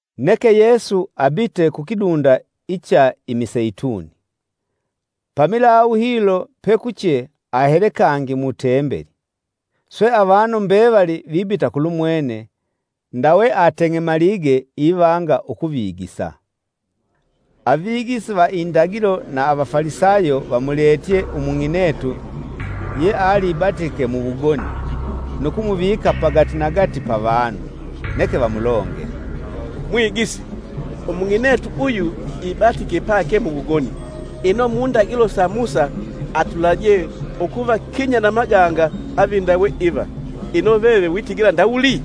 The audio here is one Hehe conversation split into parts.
[Neke Yesu abite kukidunda icha imiseituni. Pamilawu hilo pekuche ahele kangi mu tembeli. Swe avanu mbevali vibita kulumwene, ndawe ivanga ateng'emalige ivanga ukuvigisa. Avigisi va indagilo na Avafalisayo vamuletye umung'inetu yealibatike muwugoni, nu kumuvika pagatinagati pavanu. Neke vamulongele, “Mwigisi! Umung'inetu uyu ibatike pake muwugoni. Ino mundagilo sa Musa atulaje ukuvakinya na maganga avindawe iva. Ino veve witigila ndawuli?”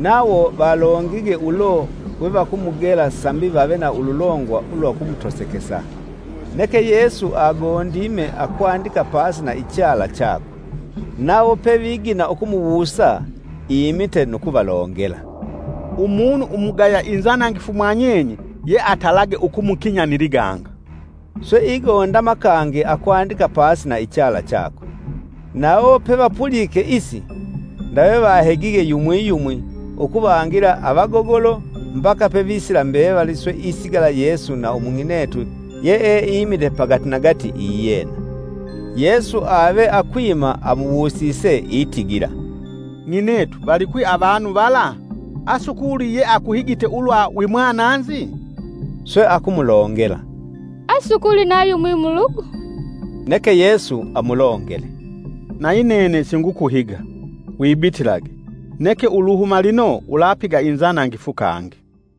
Nawo valongige ulo we vakumugela sambi vave na ululongwa lwa ukumutosekesa. Neke Yesu agondime akwandika pasi na ichala chakwe. Nawo pevagina ukumuwusa imite nu kuvalongela, “Umunu umugaya inzanangifu mwanyenye yeatalage ukumukinya ni liganga.” Swe igondama kangi akwandika pasi na ichala chakwe. Nawo pevapulike isi, ndawe vahegige yumwi yumwi ukuvangila avagogolo, mbaka pevisila mbevali swe isigala Yesu na umung'inetu yeeimile pagatinagati iyena. Yesu ave akwima amuwusise atigile, “Ng'inetu valikwi avanu vala? Asukuli yeakuhigite ulwa wimwananzi?” Swe akumulongela asukuli na yumwi Mulugu. Neke Yesu amulongele, “Nayi nene singukuhiga. Wibitilage; neke uluhuma lino ulapiga inzanangifu kangi.”]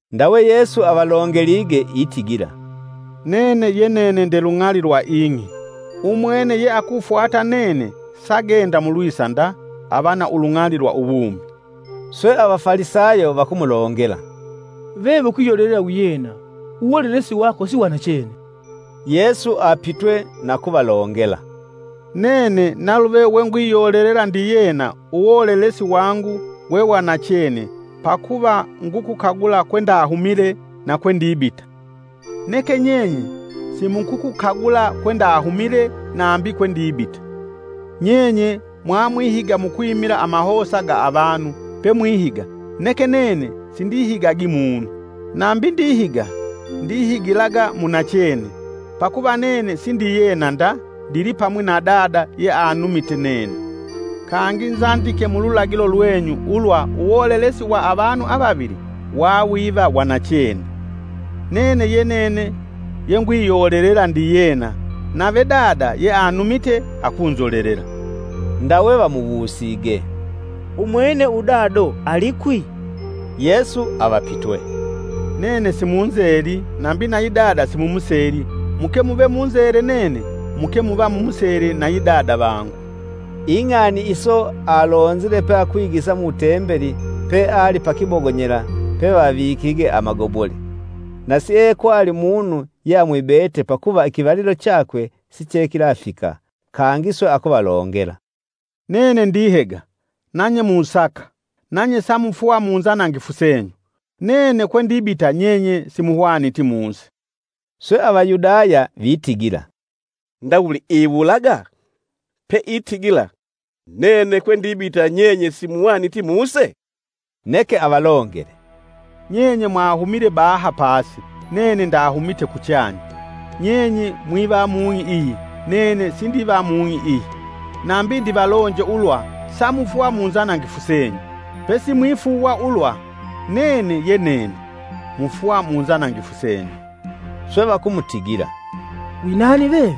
Ndawe Yesu avalongelige itigila, “Nene ye nene nde lung'ali lwa ing'i. Umwene yeakufwata nene sagenda mulwisa nda ava na ulung'ali lwa uwumi.” Swe Avafalisayo vakumulongela, “Veve ukwiyolelela wiyena uwolelesi wako si wanachene.” Yesu apitwe na kuvalongela, “Nene naluve wengwiyolelela ndiyena uwolelesi wangu we wanachene pakuva ngukukagula kwendahumile na kwendibita. Neke nyenye simukukukagula kwendahumile nambi kwendibita. Nyenye mwamwihiga mukwimila amahosa ga avanu pemwihiga, neke nene sindihigagi munu. Nambi ndihiga, ndihigilaga munachene, pakuva nene sindiyena nda ndilipamwi na Dada yeanumite nene. Kangi nzandike mululagilo lwenyu ulwa uwolelesi wa avanu avavili wawiva wanachene. Nene ye nene yengwiyolelela ndiyena nave Dada yeanumite akunzolelela.” Ndawe vamuwusige, “Umwene Udado alikwi?” Yesu avapitwe, “Nene simunzeli nambi nayi Dada simumuseli muke muve munzele nene muke muva mumusele nayi Dada vangu.” Ing'ani iso alonzile peakwigisa mu tembeli, peali pakibogonyela pevavikige amagobole. Na siekwali munu yeamwibete pakuva ikivalilo chakwe sichekilafika. Kangi swe akuvalongela, “Nene ndihega, nanye musaka, nanye samufwa munzanangifu senyu. Nene kwendibita nyenye simuhwaniti muse.” Swe Avayudaya vitigila, “Ndawuli iwulaga? Pe itigila: ‘Nene kwendibita nyenye simuhwaniti muse?’” Neke avalongele, “Nyenye mwahumile baha pasi nene ndahumite kuchanya. Nyenye mwiva mung'i iyi nene sindiva mung'i iyi. Nambi ndivalonje ulwa samufwa munzanangifu senyu; pesi mwifuuwa ulwa ‘Nene ye nene’ mufwa munzanangifu senyu.” Swe vakumutigila, “Winani veve?”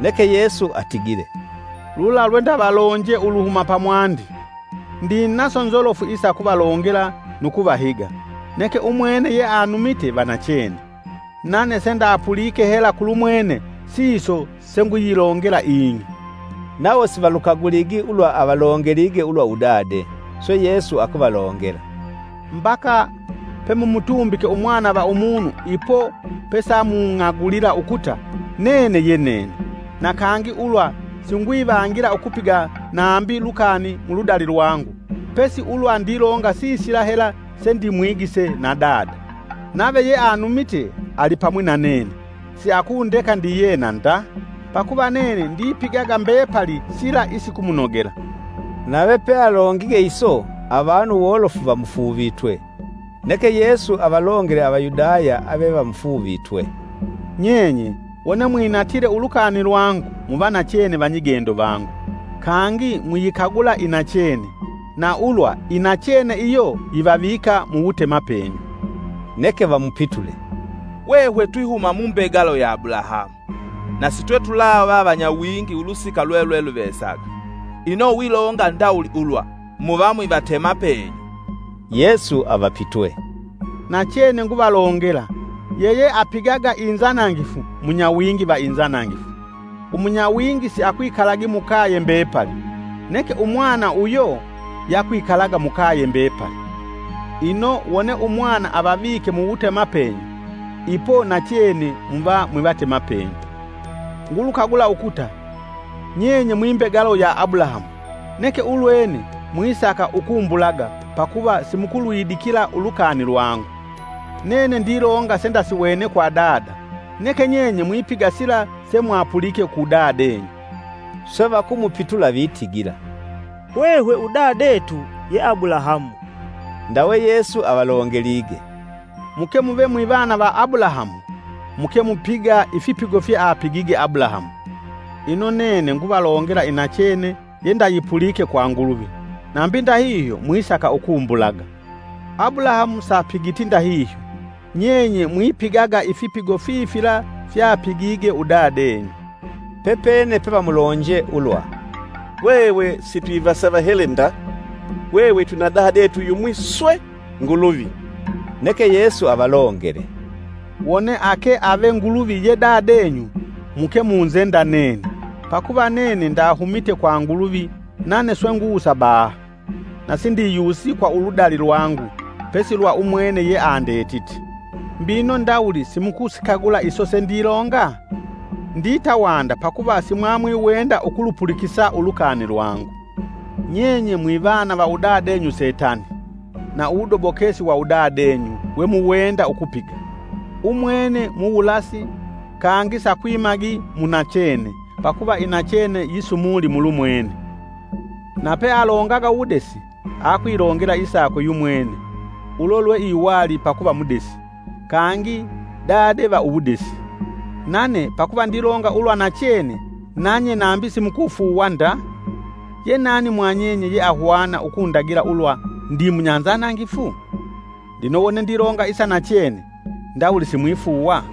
Neke Yesu atigile, “Lula lwendavalonje uluhuma pamwandi! Ndinaso nzolofu isa ukuvalongela nu kuvahiga. Neke umwene yeanumite vanachene; nane sendapulike hela kulumwene siso senguyilongela ing'i.” Nawo Sivalukagwi ulwa avalongelige ulwa udade. Swe Yesu akuvalongela, “Mbaka pemumutumbike Umwana va Umunu ipo pesamung'agulila ukuta, ‘Nene ye nene’, na kangi ulwa singwivangila ukupiga nambi lukani muludali lwangu, pesi ulwa ndilonga sisila hela sendimwigise na Dada. Nave yeanumite alipamwi na nene; siakundeka ndiyena nda, pakuva nene ndipigaga mbepali sila isikumunogela.” Nave pealongige iso avanu wolofu vamufuuvitwe. Neke Yesu avalongele Avayudaya avevamufuuvitwe, “Nyenye Wone mwinatile ulukani lwangu muva nachene vanyigendo vangu. Kangi muyikagula inachene, na ulwa nachene iyo yivavika muwutemapenyu.” Neke vamupitule, “Hwehwe twihuma mumbegalo ya Abulahamu, na sitwetulava vanyawingi ulusika lwelweluvesaga. Ino wilonga ndawuli ulwa, ‘Muva mwivatemapenyu.’” Yesu avapitwe, “Nachene nguvalongela, yeyeapigaga inzanangifu munyawingi va inzanangifu. Umunyawingi siakwikalagi mukaye mbepali, neke umwana uyo yakwikalaga mukaye mbepali. Ino wone umwana avavike mu wutemapenyu, ipo nachene muva mwivatemapenyu. Ngulukagula ukuta nyenye mwimbegalo ya Abulahamu. Neke ulwene, mwisaka ukumbulaga pakuva simukulwidikila ulukani lwangu. Nene ndilonga sendasiwene kwa Dada, neke nyenye mwipiga sila semwapulike ku Dadenyu.” Swe vakumupitula vitigila, “Hwehwe Udadetu ye Abulahamu!” Ndawe Yesu avalongelige, “Muke muve mwivana va Abulahamu, muke mupiga ifipigo fyeapigige Abulahamu. Ino nene nguvalongela inachene yandayipulike kwa Nguluvi, nambi ndahihyo mwisaka ukumbulaga. Abulahamu sapigiti ndahihyo. Nyenye mwipigaga ifipigo fifila fyapigige udadenyu.” Pepene pevamulonje ulwa, “Hwehwe sitwivasavahele nda, hwehwe twina Dadetu yumwi swe, Nguluvi.” Neke Yesu avalongele, “Wone ake ave Nguluvi ye Dadenyu muke munzenda nene, pakuva nene ndahumite kwa Nguluvi nane swe ngusa baha. Na sindiyusi kwa uludali lwangu, pesi lwa umwene yeandetite. Mbino ndawuli simukusikagula iso sendilonga? Ndita wanda pakuva simwamwiwenda ukulupulikisa ulukani lwangu. Nyenye mwivana va Udadenyu Setani, na uwudobokesi wa udadenyu, Wemuwenda ukupiga. Umwene muwulasi, kangi sakwimagi mu nachene pakuva inachene isumuli mulumwene. Na pealongaga uwudesi; akwilongela isakwe yumwene, ulo lweiwali pakuva mudesi, kangi Dade va uwudesi. Nane pakuva ndilonga ulwa nachene nanye nambi simukufuuwa nda. Ye nani mwa nyenye yeahwana ukundagila ulwa ndi munyanzanangifu? Lino wone ndilonga isa nachene, ndawuli simwifuuwa?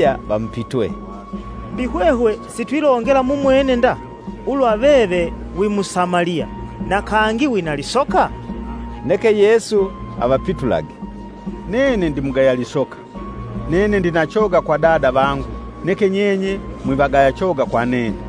Avayudaya vamupitwe, “Mbi hwehwe sitwilongela mumwene nda, ulwa veve wi Musamaliya, na kangi wina lisoka?” Neke Yesu avapitulage, “Nene ndimugaya lisoka; nene ndina choga kwa Dada vangu, neke nyenye mwivagaya choga kwa nene.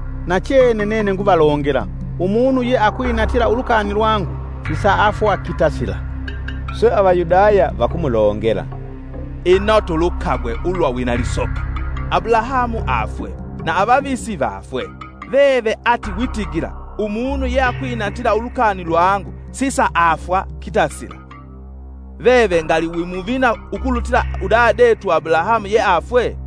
Nachene nene nguvalongela, umunu yeakwinatila ulukani lwangu sisaafwa kitasila!” Swe Avayudaya vakumulongela, “Ino tulukagwe ulwa wina lisoka! Abulahamu afwe, na avavisi vafwe, veve ati witigila ‘umunu yeakwinatila ulukani lwangu sisaafwa kitasila!’ Veve ngali wi muvina ukulutila udadetu Abulahamu yeafwe?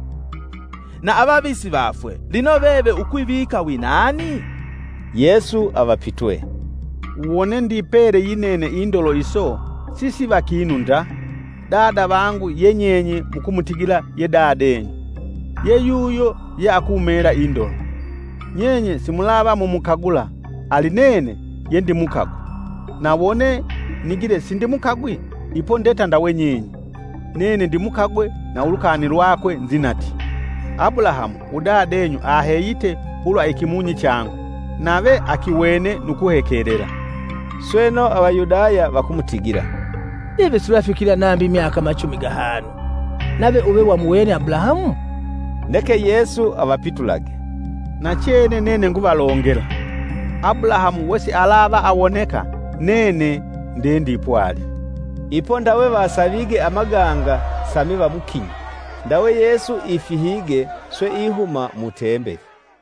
Na avavisi vafwe, lino veve ukwivika winani?” Yesu avapitwe, “Wone ndipele yinene indolo iso sisiva kinu nda. Dada vangu ye nyenye mukumutigila ye Dadenyu, ye yuyo yeakumela indolo. Nyenye simulava mumukagula, ali nene yendimukagwe. Na wone, nigile sindimukagwi, ipo ndeta ndawe nyenye. Nene ndimukagwe na ulukani lwakwe nzinatye. Abulahamu, Udadenyu aheyite ulwa ikimunyi changu, nave akiwene nu kuhekelela.” Sweno, Avayudaya vakumutigila, “Veve sulafikila nambi myaka machumi gahanu, nave uve vamuwene Abulahamu?” Neke Yesu avapitulage, “Nachene nene nguvalongela, Abulahamu wesialavaawoneka, nene nde ndipwali.” Ipo ndawe vasavige amaganga sambi vamukinye, ndawe Yesu ifihige swe ihuma mu tembeli.